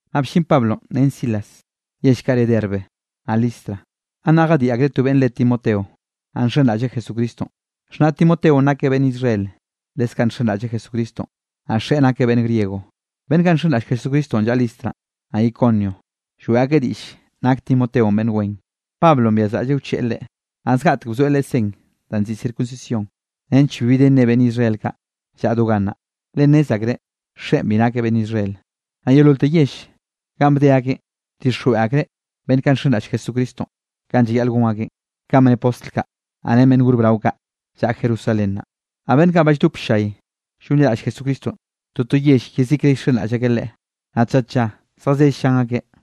Naꞌ bllin Pablonꞌ ren Silas yell kaꞌ re Derbe naꞌ Listra. Gannaꞌ jadiꞌ akreꞌ to beꞌnn re Timoteo, naꞌ nxenraꞌlleꞌ Jesucristonꞌ, xhnaꞌ Timoteonꞌ nakeꞌ beꞌnn Israel, leskaꞌ nxenraꞌlleꞌ Jesucristonꞌ, naꞌ xeꞌe nakeꞌ beꞌnn griego. Beꞌnn kaꞌ nxenraꞌll Jesucristonꞌ llaꞌa Listra, naꞌ Iconio, lloeꞌ akeꞌ diꞌll nak Timoteonꞌ beꞌnn wen. Pablonꞌ byazraꞌlleꞌ wcheꞌe leꞌe, naꞌ zgaꞌtek bzoeꞌ leꞌe sen danꞌ nziꞌi circuncisión, nench bibi de nne beꞌnn Israel kaꞌ llaꞌa do gannaꞌ, le nnez akreꞌ xeꞌen bi nakeꞌ beꞌnn Israel. Naꞌ yeololte yell ganꞌ bde akeꞌn, bdixjweꞌ akreꞌ beꞌnn kaꞌ ba nxenraꞌll Jesucristonꞌ kanꞌ llayaꞌl gon akeꞌ, kanꞌ bne postl kaꞌ, naꞌ ren beꞌnn gor brao kaꞌ llaꞌa Jerusalén naꞌ. Naꞌ Beꞌnn kaꞌ ba lldop ll-llay llonliraꞌll Jesucristonꞌ, toto yell yezikre llxenraꞌll akeꞌ Leꞌe, naꞌ tlla tlla zjazell llan akeꞌ.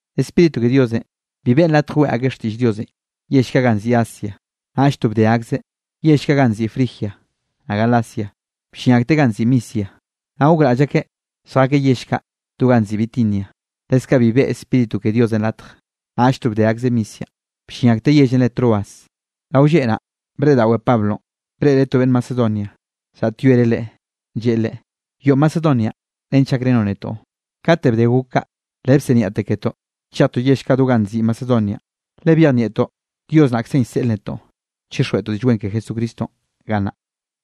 Spíritu ke Diosenꞌ bi beꞌn latj weꞌe akeꞌ xtiꞌll Diosenꞌ yell kaꞌ ganꞌ nziꞌi Asia, naꞌll to bde akzeꞌ yell kaꞌ ganꞌ nziꞌi Frigia naꞌ Galacia. Bllin akteꞌ ganꞌ nziꞌi Misia, naꞌ gokraꞌll akeꞌ lljakeꞌ yell kaꞌ do ganꞌ nziꞌi Bitinia, leskaꞌ bi beꞌe Spíritu ke Diosenꞌ latj. Naꞌll to bde akzeꞌ Misia, bllin akteꞌ yellenꞌ re Troas. Rao lleꞌ naꞌ, breꞌdaꞌwe Pablonꞌ, breꞌreꞌ to beꞌnn Macedonianꞌ llaꞌtyoereꞌ leꞌe, lleꞌe leꞌe: “Yoꞌo Macedonianꞌ nench gakrenoꞌ netoꞌ.” Kate bde gok kaꞌ, le bsiniaꞌte ketoꞌ chejtoꞌ yell kaꞌ do ganꞌ nziꞌi Macedonianꞌ, le byejnieꞌtoꞌ Dios naꞌkzenꞌ llseꞌleꞌ netoꞌ chixjweꞌtoꞌ Diꞌll Wen ke Jesucristonꞌ gannaꞌ.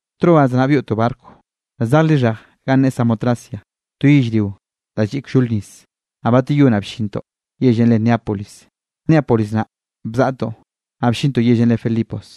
Troas naꞌ byoꞌtoꞌ barco da zej lixhej ganꞌ ne Samotracia, to yellrio da lliꞌ kllol nis, naꞌ bateyó naꞌ bllintoꞌ yellenꞌ re Neápolis. Neápolis naꞌ bzaꞌtoꞌ, naꞌ bllintoꞌ yellenꞌ re Filipos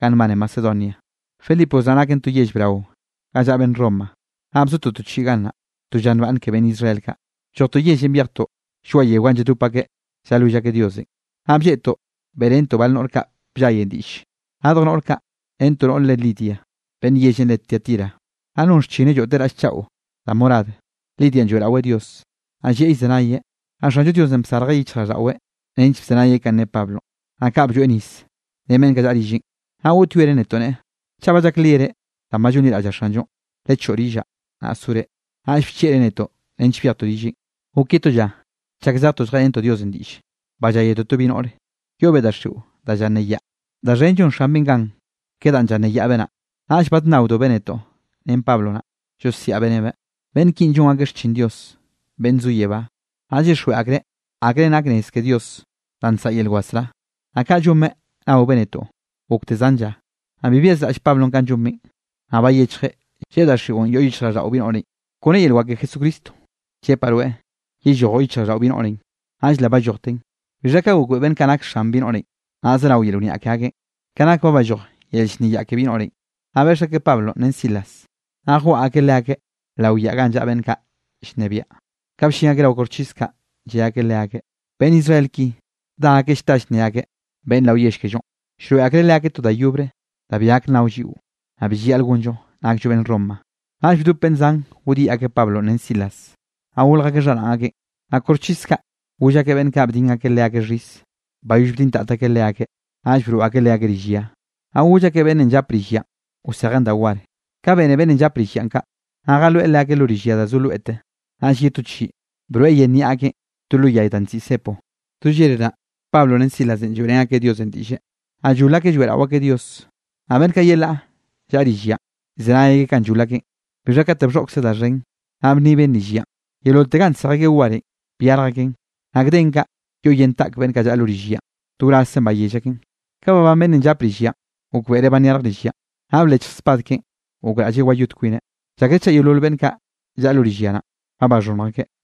ganꞌ nbane Macedonia, Filipos naꞌ naken to yell brao ga llaꞌa beꞌnn Roma, naꞌ bzotoꞌ to chiꞌi gannaꞌ. To lla nbaꞌnne ke beꞌnn Israel kaꞌ, bllojtoꞌ yellenꞌ byejtoꞌ lloaꞌ yeo ga lladop akeꞌ llalwill akeꞌ Diosenꞌ, naꞌ blleꞌtoꞌ beꞌrentoꞌ bal noꞌr kaꞌ bllayenꞌ diꞌlle. Radj noꞌr kaꞌ ren to noꞌr re Lidia, beꞌnn yellenꞌ re Tiatira, naꞌ non xchineꞌ lloꞌteꞌ raꞌll chaꞌo da morad. Lidianꞌ lloeꞌraweꞌ Dios, naꞌ llieꞌ llzenayeꞌ, naꞌ Xanllo Diosenꞌ bsarjeꞌ yichjraꞌlldaꞌweꞌ nench bzenayeꞌ kanꞌ ne Pablonꞌ. Naꞌ kaꞌ blloeꞌ nis ren beꞌnn kaꞌ llaꞌa rilleꞌn, naꞌ goꞌtyoereꞌ netoꞌ neꞌe: —Chaꞌ ba llakliere danꞌ ba llonliraꞌllaꞌ Xanllonꞌ, lechoꞌo rillaꞌ, naꞌ sore. Naꞌll bchieꞌreꞌ netoꞌ nench byejtoꞌ rilleꞌn. Gok ye to lla chak zejtoꞌ lljeꞌrentoꞌ Diosenꞌ diꞌlle, balláyetoꞌ to bi noꞌre, yoꞌbeꞌ daxiꞌo da llanneyaꞌ. Da xhen llon xanbeꞌ gan ke danꞌ llanneyaꞌbeꞌ naꞌ. Naꞌll badnnaobeꞌ netoꞌ ren Pablo naꞌ, llosiaꞌbeꞌ nebeꞌ: —¡Beꞌnn kinꞌ llon akeꞌ xchin Dios, beꞌnn zo yebá, naꞌ llyixjweꞌ akreꞌ akre nak nez ke Diosenꞌ danꞌ nsaꞌa yel wasrá! Naꞌ kaꞌ llonbeꞌ naobeꞌ netoꞌ gokte zan lla, naꞌ bi byazraꞌll Pablonꞌ kanꞌ llonbeꞌ, naꞌ bayechjeꞌ, lleꞌe daxiꞌon yoꞌ yichjraꞌlldaꞌo bi noꞌrenꞌ: —Kone yel wak ke Jesucristo, llepaꞌ rweꞌ yellojoꞌ yichjraꞌlldaꞌo bi noꞌrenꞌ. Naꞌll le ballojten. Bixha ka gokbeꞌe beꞌnn kaꞌ nak xan bi noꞌrenꞌ, naꞌ zerao yel wniaꞌ ke akeꞌn, ka nak ba balloj yel llnneyaꞌ ke bi noꞌrenꞌ, naꞌ beꞌx akeꞌ Pablonꞌ ren Silas, naꞌ jwaꞌa akeꞌ leakeꞌ lao yaꞌa ganꞌ llaꞌa beꞌnn kaꞌ llnebiaꞌ. Ka bllin akeꞌ rao koxchis kaꞌ, lle akeꞌ leakeꞌ: —Beꞌnn Israel ki da akeꞌ llta llnne akeꞌ beꞌnn rao yell kellonꞌ. Llroeꞌ akreꞌ leakeꞌ to da yobre da bi gak nnao lliꞌo, naꞌ bi llayaꞌl gonllon nakllo beꞌnn Roma. Naꞌll bdop beꞌnn zan goꞌdyiꞌ akeꞌ Pablonꞌ ren Silas, naꞌ golj akeꞌ xharaꞌn akeꞌn, naꞌ koxchis kaꞌ goll akeꞌ beꞌnn kaꞌ bdin akeꞌ leakeꞌ xhis. Bayoll bdintat akeꞌ leakeꞌ, naꞌll broꞌ akeꞌ leakeꞌ rill ya, naꞌ goll akeꞌ beꞌnnenꞌ llap rill yanꞌ wsejeꞌn da war. Ka bene beꞌnnenꞌ llap rill yanꞌ kaꞌ, naꞌ jaloeꞌ leakeꞌ lo rill ya da zo loete. Naꞌll ye to chiꞌi, broeꞌ yen niaꞌ akeꞌn to lo yay da nziꞌi cepo. Do llere naꞌ, Pablo ren Silas lloeꞌrén akeꞌ Diosenꞌ diꞌlle, naꞌ llol akeꞌ lloeꞌrao akeꞌ Dios, naꞌ beꞌnn kaꞌ yelaꞌ llaꞌa rill yanꞌ, llzenay akeꞌ kanꞌ llol akeꞌn. Bixha kate bxhoꞌkze da xhen, naꞌ bnniben rill yanꞌ, yeololte ganꞌ nsej akeꞌ warenꞌ, byarj aken naꞌ gden kaꞌ yoꞌ yen taꞌk beꞌnn kaꞌ llaꞌa lo rill yanꞌ, to wrazze bayell akeꞌn. Ka babán beꞌnnenꞌ llap rill yanꞌ, gokbeꞌreꞌ ba nyarj rill yanꞌ, naꞌ blechj spad keꞌen gokraꞌlleꞌ wayot kwineꞌ, llakreꞌ chaꞌ yeolol beꞌnn kaꞌ llaꞌa lo rill ya naꞌ, ba baxhonnj akeꞌ.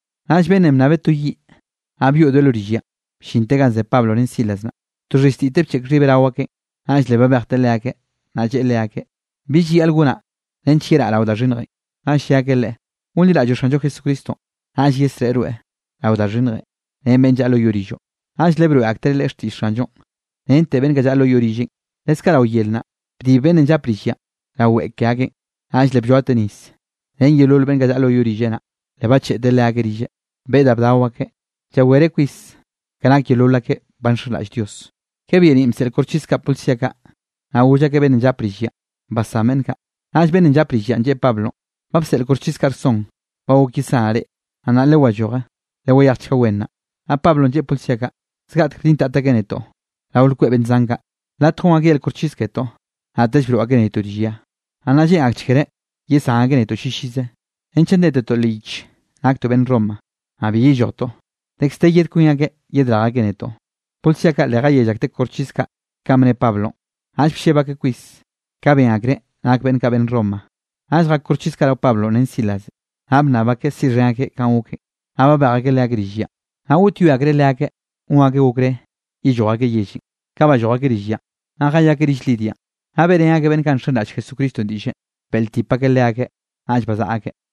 Naꞌll beꞌnnenꞌ bnnabeꞌ to yiꞌ, naꞌ byoꞌdoeꞌ lo rill yanꞌ, bllinte ganꞌ ze Pablo ren Silas naꞌ, to xhiztiteꞌ bcheꞌk xhibeꞌ rao akeꞌn. Naꞌll le babejteꞌ leakeꞌ, naꞌ lleꞌe leakeꞌ: —¿Bi llayaꞌl gonaꞌ nench yeraꞌ rao da xhinnjenꞌ? Naꞌll lle akeꞌ leꞌe: —Gonliraꞌlloꞌ Xanllo Jesucristonꞌ, naꞌll yesreꞌe rweꞌ rao da xhinnjenꞌ ren beꞌnn llaꞌa lo yoꞌ rilloꞌ. Naꞌll le broeꞌ aktereꞌ leꞌe xtiꞌll Xanllonꞌ rente beꞌnn kaꞌ llaꞌa lo yoꞌ rilleꞌ. Leskaꞌ rao yer naꞌ, bdib beꞌnnenꞌ llap rill yanꞌ rao weꞌe ke akeꞌn, naꞌll le blloateꞌ nis ren yeolol beꞌnn kaꞌ llaꞌa lo yoꞌ rilleꞌ naꞌ. Le bacheꞌteꞌ leakeꞌ rilleꞌ, beꞌe da bdao akeꞌ, llawereꞌ kwis ka nak yeolol akeꞌ ba nxenraꞌll Dios. Ka byeniꞌn bseꞌl koxchis kaꞌ policía kaꞌ, naꞌ goll akeꞌ beꞌnnenꞌ llap rill yanꞌ: —Basán beꞌnn kaꞌ. Naꞌll beꞌnnenꞌ llap rill yanꞌ lleꞌe Pablonꞌ: —Ba bseꞌl koxchis kaꞌ rson ba gok yesanaꞌ reꞌ, naꞌ nnaꞌ lewalloje, lewayejchga wen nnaꞌ. Naꞌ Pablonꞌ lleꞌe policía kaꞌ: —Zgaꞌtek bdintat akeꞌ netoꞌ rao lkweꞌ beꞌnn zan kaꞌ latj gon akeꞌ yel koxchis ketoꞌ, naꞌtell broꞌ akeꞌ netoꞌ rill ya, naꞌ nnaꞌ lleꞌn akchekreꞌ yesán akeꞌ netoꞌ llillize, renchaꞌ ndetetoꞌ leꞌ yich naktoꞌ beꞌnn Roma. Naꞌ bi yellojtoꞌ, dekz de yed kwin akeꞌ yedrej akeꞌ netoꞌ. Policía kaꞌ le jayell akteꞌ koxchis kaꞌ kanꞌ bne Pablonꞌ, naꞌll blleb akeꞌ kwis, ka ben akreꞌ nak beꞌnn kaꞌ beꞌnn Roma. Naꞌll jak koxchis kaꞌ rao Pablonꞌ ren Silas, naꞌ bnnab akeꞌ siꞌxhen akeꞌ kanꞌ goken, naꞌ babej akeꞌ leakeꞌ rill yanꞌ. Naꞌ goꞌtyoe akreꞌ leakeꞌ gon akeꞌ okré yelloj akeꞌ yellenꞌ. Kaꞌ balloj akeꞌ rill yanꞌ, naꞌ jayakeꞌ rill Lidianꞌ, naꞌ beꞌrén akeꞌ beꞌnn kaꞌ nxenraꞌll Jesucristonꞌ diꞌlle, beꞌltip akeꞌ leakeꞌ, naꞌll bazaꞌa akeꞌ.